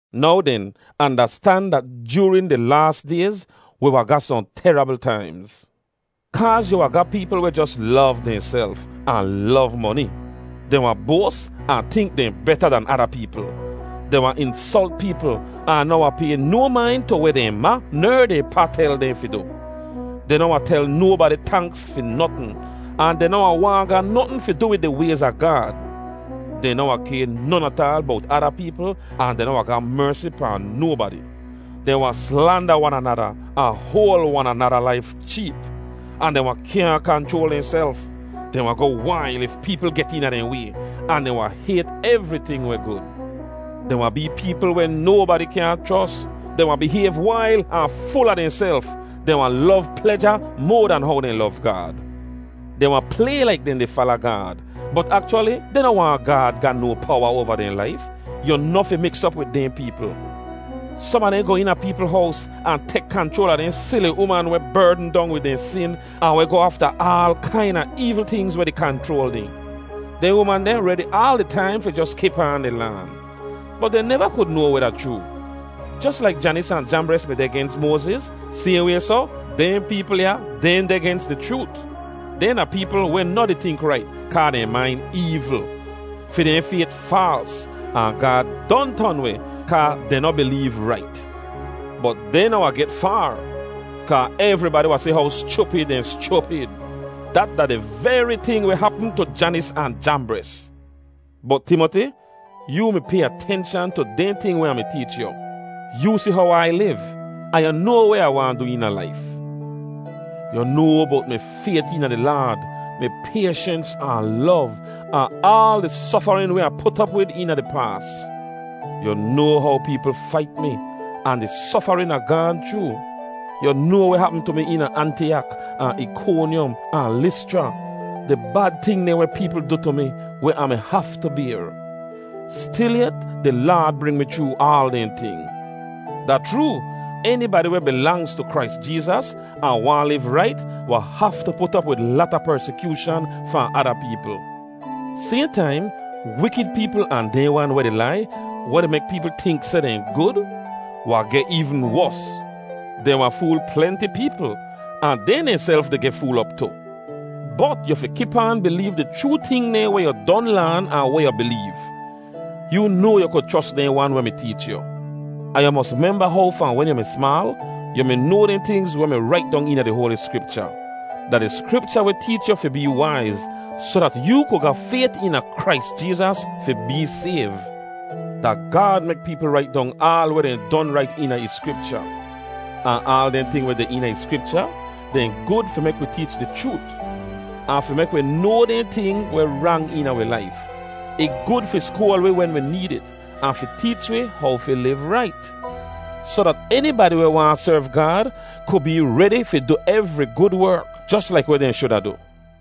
Now den, andastan dat joorin di laas dayz, wi wahn ga sohn terabl taimz. Kaaz yu wahn ga peepl weh jos lov dehnself, ahn lov moni. Dehn wahn boas ahn tink dehn beta dan ada peepl. Dehn wahn insolt peepl, ahn noh wahn pay no main tu weh dehn ma ner dehn pa tel dehn fi du. Dehn noh wahn tel nobadi tanks fi notn, ahn dehn noh wahn waahn ga notn fi du wid di wayz a Gaad. Dehn noh wahn kay non ataal bowt ada peepl ahn dehn noh wahn ga mersi pahn nobadi. Dehn wahn slanda wan anada ahn hoal wan anada laif cheep, ahn dehn wahn kyaahn kanchroal dehnself. Dehn wahn goh wail if peepl get eena dehn way, ahn dehn wahn hayt evriting weh gud. Dehn wahn bee peepl weh nobadi kyaahn chros. Dehn wahn bihayv wail ahn ful a dehnself; dehn wahn lov pleja moa dan how dehn lov Gaad. Dehn wahn play laik dehn di fala Gaad, bot akchwali dehn noh waahn Gaad ga no powa oava dehn laif. Yu noh fi miks op wid dehn peepl. Som a dehn goh eena peepl hows ahn tek kanchroal a dehn sili uman weh berdn dong wid dehn sin ahn weh goh afta aal kaina eevl tingz weh di kanchroal dehn. Dehn uman deh redi aal di taim fi jos kip aan di laan, bot dehn neva kud noa weh da chroo. Jos laik Janis ahn Jambres mi deh gens Moaziz, sayhn way soh, dehn peepl ya, dehn deh gens di chroot. Dehn da peepl weh noh di tink rait kaa dehn main eevl. Fi dehn fayt faals, ahn Gaad don ton weh kaa dehn noh bileev rait. Bot dehn noh wahn get faar, kaa evribadi wahn si how schupid dehn schupid. Dat da di veri ting weh hapm tu Janis ahn Jambres. Bot Timoti, yoo mi pay atenshan tu dehn ting weh Ah mi teech yu. Yoo si how Ai liv, ahn yu noa weh Ah waahn du eena laif. Yu noa bowt mi fayt eena di Laad, mi payshens, ahn lov, ahn aal di sofarin weh Ah put op wid eena di paas. Yu noa how peepl fait mi, ahn di sofarin Ah gaahn chroo. Yu noa weh hapm tu mi eena Antiyak ahn Ikonyom ahn Lischra, di bad ting dehn weh peepl du tu mi weh Ah mi haftu bayr. Stilyet di Laad bring mi chroo aal dehn ting. Da chroo, enibadi weh bilangz tu Krais Jeezas ahn waahn liv rait wahn haftu put op wid lata persikyooshan fahn ada peepl. Sayhn taim, wikid peepl ahn dehn wan weh di lai, weh di mek peepl tink seh dehn gud, wahn geh eevn wos. Dehn wahn fool plenti peepl, ahn dehn dehnself di geh fool op tu. Bot yu fi kip aan bileev di chroo ting dehn weh yu don laan ahn weh yu bileev. Yoo noa yu kud chros dehn wan weh mi teech yu. Ahn yu mos memba how fahn wen yu mi smaal, yu mi noa dehn tingz weh mi rait dong eena di Hoali Skripcha. Da di Skripcha weh teech yu fi bee waiz soh dat yoo ku ga fayt eena Krais Jeezas fi bee sayv. Da Gaad mek peepl rait dong aal weh dehn don rait eena ih Skripcha. Ahn aal dehn ting weh deh eena ih Skripcha, dehn gud fi mek wi teech di chroot, ahn fi mek wi noa dehn ting weh rang eena wi laif. Ih gud fi skoal wi wen wi need it, ahn fi teech wi how fi liv rait, soh dat enibadi weh waahn serv Gaad ku bee redi fi du evri gud werk jos laik weh dehn shuda du.